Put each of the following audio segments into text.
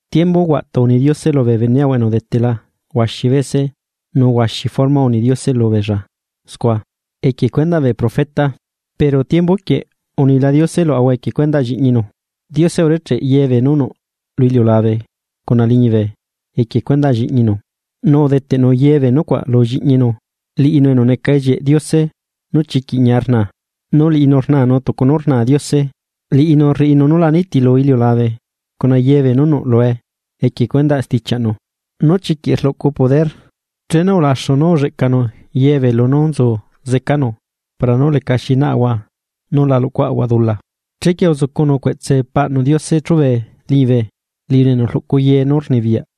Tiembu huaꞌtu uni Diose lubee beneꞌahua enu udetela huaxi bese nu huaxi forma uni Diose lubeella scua, equie cuendaꞌ bee profeta. Pero tiembu quieꞌ unila Diose luaꞌahua equie cuendaꞌ lliꞌñinu. Diose urecheꞌ yebee nú nuꞌ lu iliulabe cuna liñibe equie cuendaꞌ lliꞌñinu. Nu udeteꞌnu yebee nucuaꞌ lu lliꞌñinu. Liꞌinu enu neca ellieꞌ Diose nú chiquiꞌ ñia rnaa, nu liꞌinu rnanu tucu nú rna Diose, liꞌinu rriꞌinu nú la nitilu iliulabe cuna yebee nú nuꞌlue equie cuendaꞌ stichiaꞌnu nú chiquiꞌ rluꞌcu poder. Chenu ulaxu nú ulleꞌcanu yebee lunú nzu zecanu para nú lecaxi naꞌahua nu la luꞌcuaꞌahua dula, chequie uzucunu cueꞌtse Paꞌnu Diose chube liñibe, liꞌinu enu rluꞌcu ye nú rnibiyaꞌ.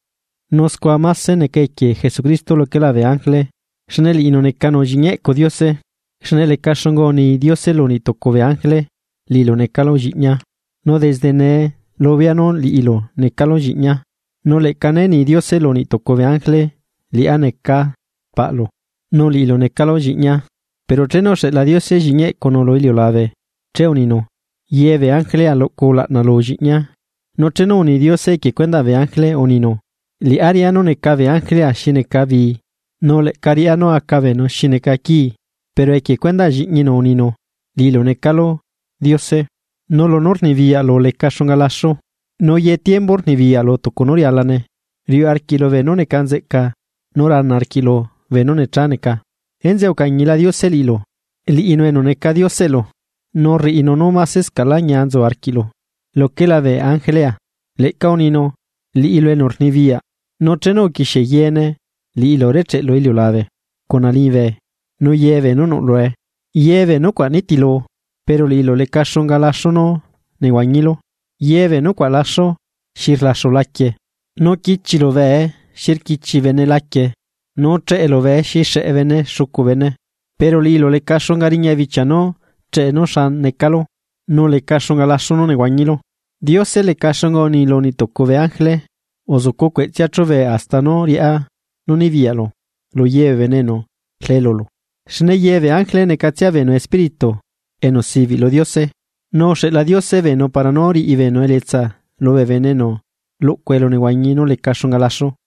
Nu scua máse neca equie Jesucristo luquela bee ángele, xne liꞌinu necanu lliꞌñi eꞌcu Diose. Xne leca xunga uni Diose lu niꞌtucu bee ángele: Liꞌilu necalu lliꞌñia, nu desde nee lubea nú liꞌilu necalu lliꞌñia. Nu leꞌca né ni Diose lu niꞌtucu bee ángele: Liꞌá neca paꞌlu, nu liꞌilu necalu lliꞌñia. Pero chenu uxeꞌla Diose lliꞌñi eꞌcunu lu iliulabe, che uninu: Yebee ángelea, luꞌcu ulaꞌna lu Lliꞌñia. Nu chenu uni Diose equie cuendaꞌ bee ángele, uninu: Liꞌá riꞌa nú neca bee ángelea xi neca bi, nu leꞌca riꞌá nú aca beenu xi neca quii. Pero equie cuendaꞌ lliꞌñinu, uninu: Liꞌilu necalu Diose. Nu lunú rnibiyaꞌlu leca xunga laxu; nu ye tiembu rnibiyaꞌlu tucu nú rialane. Riuꞌ arquiꞌlu beenú neca nzeꞌca nu rana arquiꞌlu beenú necha neca, enzeꞌe ucañila Diose liꞌilu, liꞌinu enu neca Dioseꞌlu, nu rriꞌinu nú masescaꞌlá ñia nzu arquiꞌlu, luquela bee ángelea. Leꞌca uninu: Liꞌilu enu rnibiyaꞌ, nu chenu uquixie yeene liꞌilu urecheꞌlu iliulabe, cuna liñibe nu yebeenú nuꞌ lue. Yebee nucuaꞌ nitilu. Pero liꞌilu, leca xunga laxu nú nehuañilu. Ye bee nucuaꞌ laxu, xi rlaxu laquie. Nu quichilu bee xi rquichi bene laquie, nu cheꞌelu bee xi xeꞌe bene xucu bene. Pero liꞌilu leca xunga riña bichia nú cheꞌe nú xa necalu, nu leca xunga laxu nú nehuañilu. Diose leca xunga uni lu niꞌtucu bee ángele: Uzucu cueꞌtsea chube, hasta nú riꞌá nú nibiyaꞌlu lu ye bee enu rle lulu. Xne ye bee ángele necatsia beenu espíritu enu sibiꞌ lu Diose, nu uxeꞌla Diose beenu para nú riꞌi beenu elietsa lubee bene enu luꞌcu elunehuañi nú leca xunga laxu.